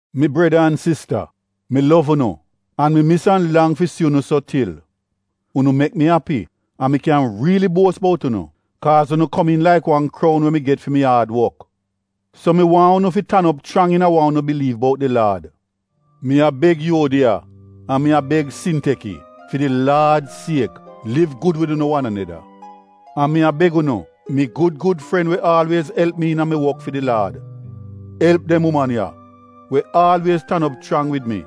Mi breda an sista, mi lov unu, an mi mis an lang fi si unu so til. Unu mek mi api, an mi kyan riili buos bout unu, kaaz unu komiin laik wan kroun we mi get fi mi aad wok. So mi waahn unu fi tan op chrang iina wa unu biliiv bout di Laad. Mi a beg Yuodiya an mi a beg Sinteki, fi di Laad siek, liv gud wid unu wan aneda. An mi a beg unu, mi gud gud fren we aalwiez elp mi iina mi wok fi di Laad, elp dem uman ya we aalwiez tan op chrang wid mi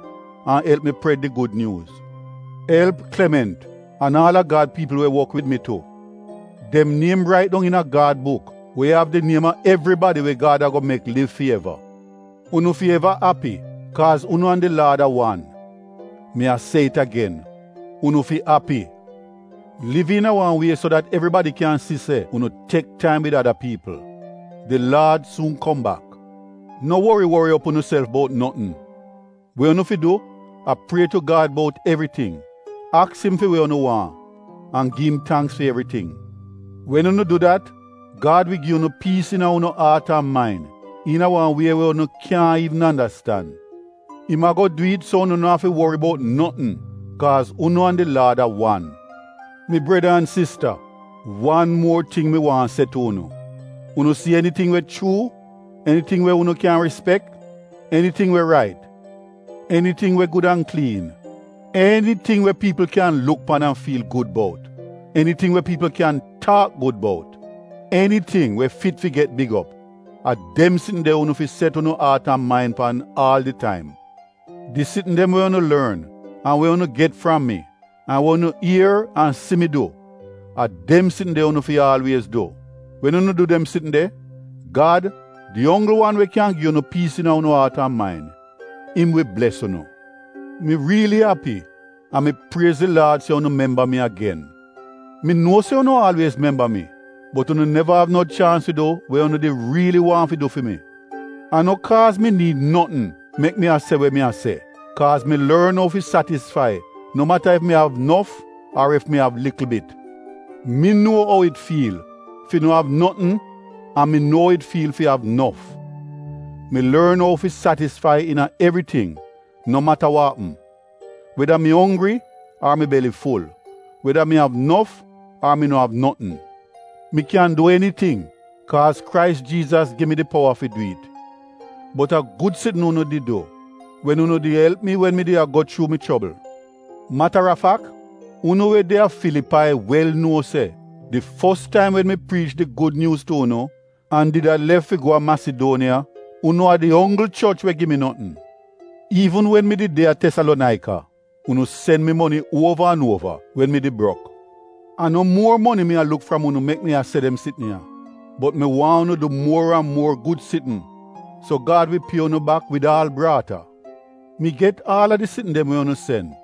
an elp mi pred di Gud Nyuuz. Elp Klement an aal a Gad piipl we wok wid mi tu. Dem niem rait dong iina Gad buk we av di niem a evribadi we Gad ago mek liv fi eva. Unu fi eva api, kaaz unu an di Laad a wan! Mi a se it agen, unu fi api! Liv iina wan wie so dat evribadi kyan si se unu tek taim wid ada piipl. Di Laad suun kom bak. No wori wori op unuself bout notn. We unu fi du a prie tu Gad bout evriting, aks im fi we unu waahn, an gi im tangks fi evriting. Wen unu du dat, Gad wi gi unu piis iina unu aat an main iina wan wie we unu kyaahn iivn andastan. Im ago du it so unu no afi wori bout notn, kaaz unu an di Laad a wan. Mi breda an sista, wan muor ting mi waahn se tu unu. Unu si eniting we chuu, eniting we unu kyan rispek, eniting we rait, eniting we gud an kliin, eniting we piipl kyan luk pan an fiil gud bout, eniting we piipl kyan taak gud bout, eniting we fit fi get big op — a dem sitn de unu fi set unu aat an main pan aal di taim. Di sitn dem we unu lorn, an we unu get fram mi, an we unu ier an si mi du, a dem sitn de unu fi aalwiez du. Wen unu du dem sitn de, Gad, di onggl wan we kyan gi unu piis iina unu aat an main, im wi bles unu. Mi riili api an mi priez di Laad se unu memba mi agen. Mi nuo se unu aalwiez memba mi, bot unu neva av no chaans fi du we unu did riili waahn fi du fi mi. A no kaaz mi niid notn mek mi a se we mi a se, kaaz mi lorn ou fi satisfai no mata ef mi av nof ar ef mi av likl bit. Mi nuo ou it fiil fi no av notn an mi nuo ou it fiil fi av nof. Mi lorn ou fi satisfai iina evriting no mata wa apm, weda mi onggri ar mi beli ful, weda mi av nof ar mi no av notn. Mi kyan du eniting, kaaz Krais Jiizas gi mi di powa fi du it. Bot a gud sitn unu did du wen unu did elp mi wen mi did a go chuu mi chobl. Mata a fak, unu we de a Filipai wel nuo se di fos taim wen mi priich di Gud Nyuuz tu unu, an did a lef fi go a Masiduoniya, unu a di onggl choch we gi mi notn. Iivn wen mi did de a Tesalonaika, unu sen mi moni uova an uova wen mi did brok. A no muor moni mi a luk fram unu mek mi a se dem sitn ya, bot mi waahn unu du muor an muor gud sitn so Gad wi pie unu bak wid aal braata. Mi get aal a di sitn dem we unu sen.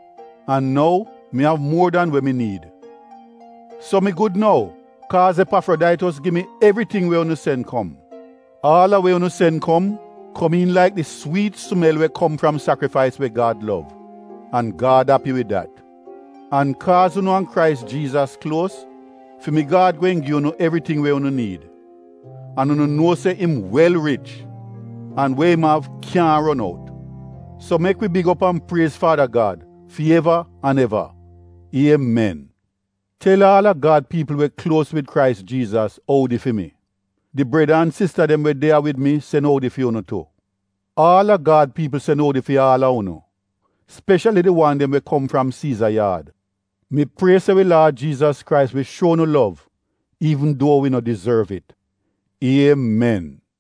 An nou, mi av muor dan we mi niid. So, mi gud nou, kaaz Epafrodaitos gi mi evriting we unu sen kom. Aal a we unu sen kom, komiin laik di swiit smel we kom fram sakrifais we Gad lov. An Gad api wid dat. An kaaz unu an Krais Jiizas kluos, fi mi Gad gweehn gi unu evriting we unu niid. An unu nuo se im wel rich, an we im av kyaahn ron out. So mek wi big op an priez Faada Gad fi eva an eva! Iemen! Tel aal a Gad piipl we kluos wid Krais Jiizas oudi fi mi. Di breda an sista dem we de ya wid mi sen oudi fi unu tu. Aal a Gad piipl sen oudi fi aal a unu, speshali di wan dem we kom fram Siiza yaad. Mi prie se wi Laad Jiizas Krais wi shuo unu lov an bles unu laif. Iemen!